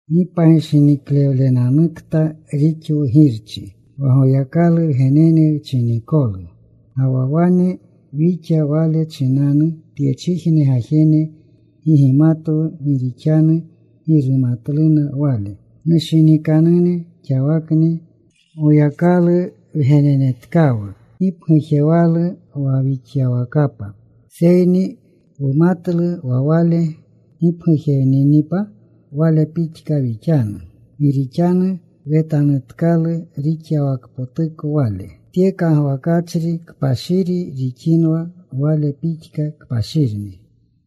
¡Gi pagishiniklewlenanukta rixwu Girchi, wa Goyakalu wgenene wchinikolu! Ga wa wane wixa. Wale chinanu tyechijne gajene gi gimatwu gi rixanu gi rumatluna Wale. Nushinikanune, xawakni Goyakalu wgenenetkawu. Gi pgujewalu wa wixyawakapa, seyni wumatlu wa Wale gipgujewninipa Wale pixka wixanu. Gi rixanu wetanutkalu rixyawakpotuko Wale. Tye kagwakachri, kpashiri rixinwa, Wale pixka kpashirni.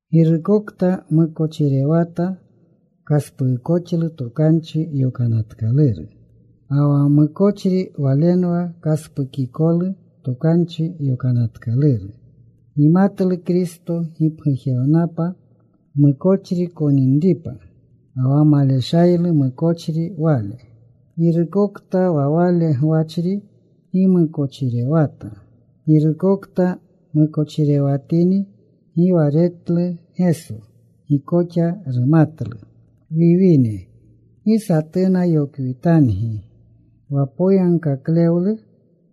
Girukokta mukochirewata kaspuukoxlu Tokanchi Yokanatkaluru. Ga wa mukochri walenwa kaspukikolu Tokanchi Yokanatkaluru. Gimatlu Kristo gipgujewnapa mukochri koninripa. Ga wa maleshaylu mukochri Wale. Girukokta wa Wale gwachri gi mukochirewata. Girukokta mukochirewatini gi wa retlu Geso. Gi koxa rumatlu. Wiwine, gi satuna yokwitangi. Wa poyagkaklewlu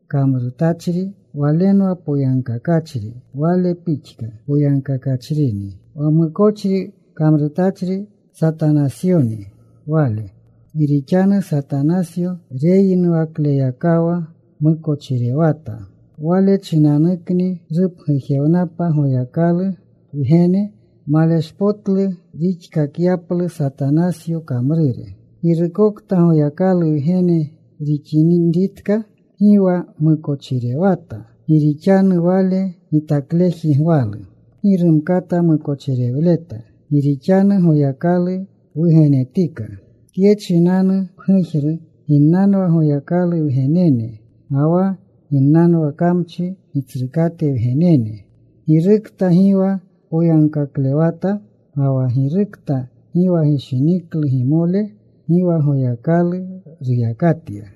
kamrutachri walenwa poyagkakachri, Wale pixka poyagkakachrini. Wa mukochri kamrutachri Satanasyonni wale. Gi rixanu Satanasyo reyinuwakleyakawa mukochirewata. Wale chinanukni rupgujewnapa Goyakalu Wgene, maleshpotlu rixkakyaplu Satanasyo kamrure. Girukokta Goyakalu wgene rixinritka, gi wa mukochirewata. Gi rixanu Wale gitakleji gwalu. Gi rumkata mukochirewleta, gi rixanu Goyakalu wugenetika. Tye chinanu pgujru ginnanwa Goyakalu wgenene ga wa ginnanwa kamchi gitsrukate wgenene. Girukta gi wa poyagkaklewata ga wa girukta gi wa gishiniklu gimole, gi wa Goyakalu ruyakatya.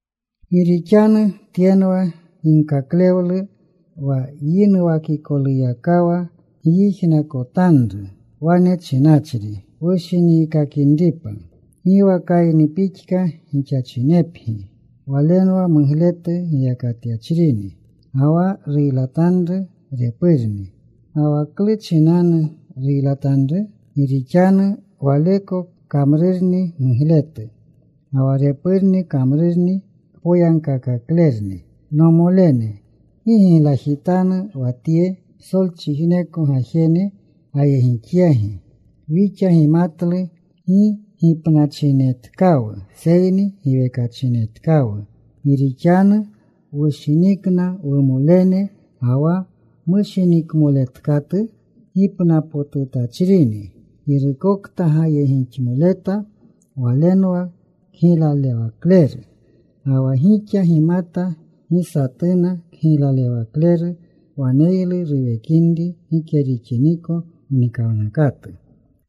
Gi rixanu tyenwa ginkaklewlu wa yinuwakikoluyakawa gyijnakotanru wane chinanchri wushiniikakinripa. Gi wa Kayni pixka gixachinepgi. Walenwa mugletu giyakatyachrini, ga wa ruylatanru repurni. ¿Ga wa klu chinanu ruylatanru? Gi rixanu waleko kamrurni mugletu, ga wa repurni kamrurni kpoyagkakaklerni. Nomolene, gi giglajitanu wa tye psolchijneko gajene gayegixyagi. Wixa gimatlu gi gipnachinetkawu, seyni giwekachinetkawu, gi rixanu wushinikna wumolene. Ga wa mushiniklewatkatu gipnapotutachrini. Girukokta gayegixmoleta walenwa kgiylalewakleru. Ga wa gixa gimata gi satuna kgiylalewakleru waneylu ruwekinri gike rixiniko mnikawnakatu.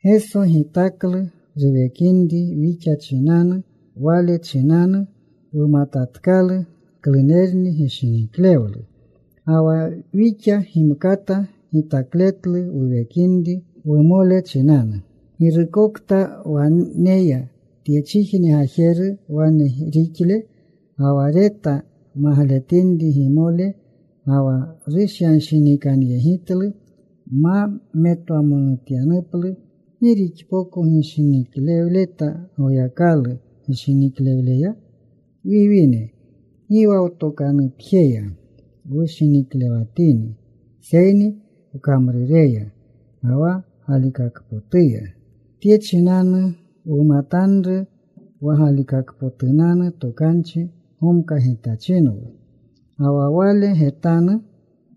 Geso gitaklu ruwekinri wixa chinanu. Wale chinanu wumatatkalu klunerni gishiniklewlu. Ga wa wixa gimkata gitakletlu wuwekinri wumole chinanu. Girukokta waneya tyechijne gajeru wane rixle ga wa reta magletinri gimole ga wa rushyanshinikanyegitlu ma metwamonutyaplu ¿gi rixpoko gishiniklewleta Goyakalu gishiniklewleya? Wiwine, gi wa wtokanupjeya wushiniklewatini seyni wkamrureya ga wa galikakpotuya. Tye chinanu wumatanru wa galikakpotunanu tokanchi gomkagitachinwu, ga wa Wale getanu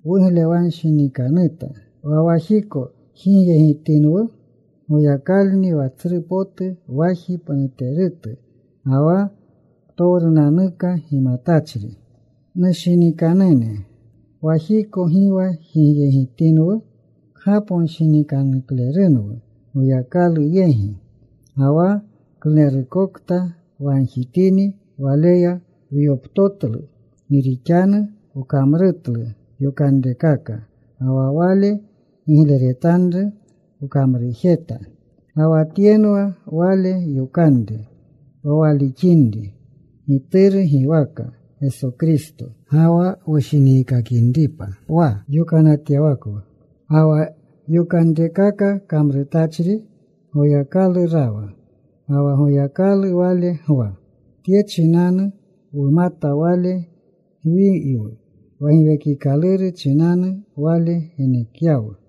wuglewanshinikanuta. Wa wajiko jigyegitinwu, Goyakalni wa tsru potu waji pnuterutu, ga wa ptowrunanuka gimatachri. Nushinikanune, wajiko gi wa jigyegitinwu, kgaponshinikanuklerunwu Goyakalu yegi. Ga wa klunerukokta wagjitini, Waleya wyoptotlu, gi rixanu wkamrutlu yokanrekaka, ga wa Wale gigleretanru wkamrujeta. Ga wa tyenwa Wale yokanre, wa walixinri Gituru giwaka Geso Kristo, ga wa wushiniikakinripa wa yokanatyawakwu. Ga wa yokanrekaka kamrutachri Goyakalu rawa. Ga wa Goyakalu wale gwa. Tye chinanu wumata Wale gwiywu, wa Giwekikaluru chinanu Wale genekyawu.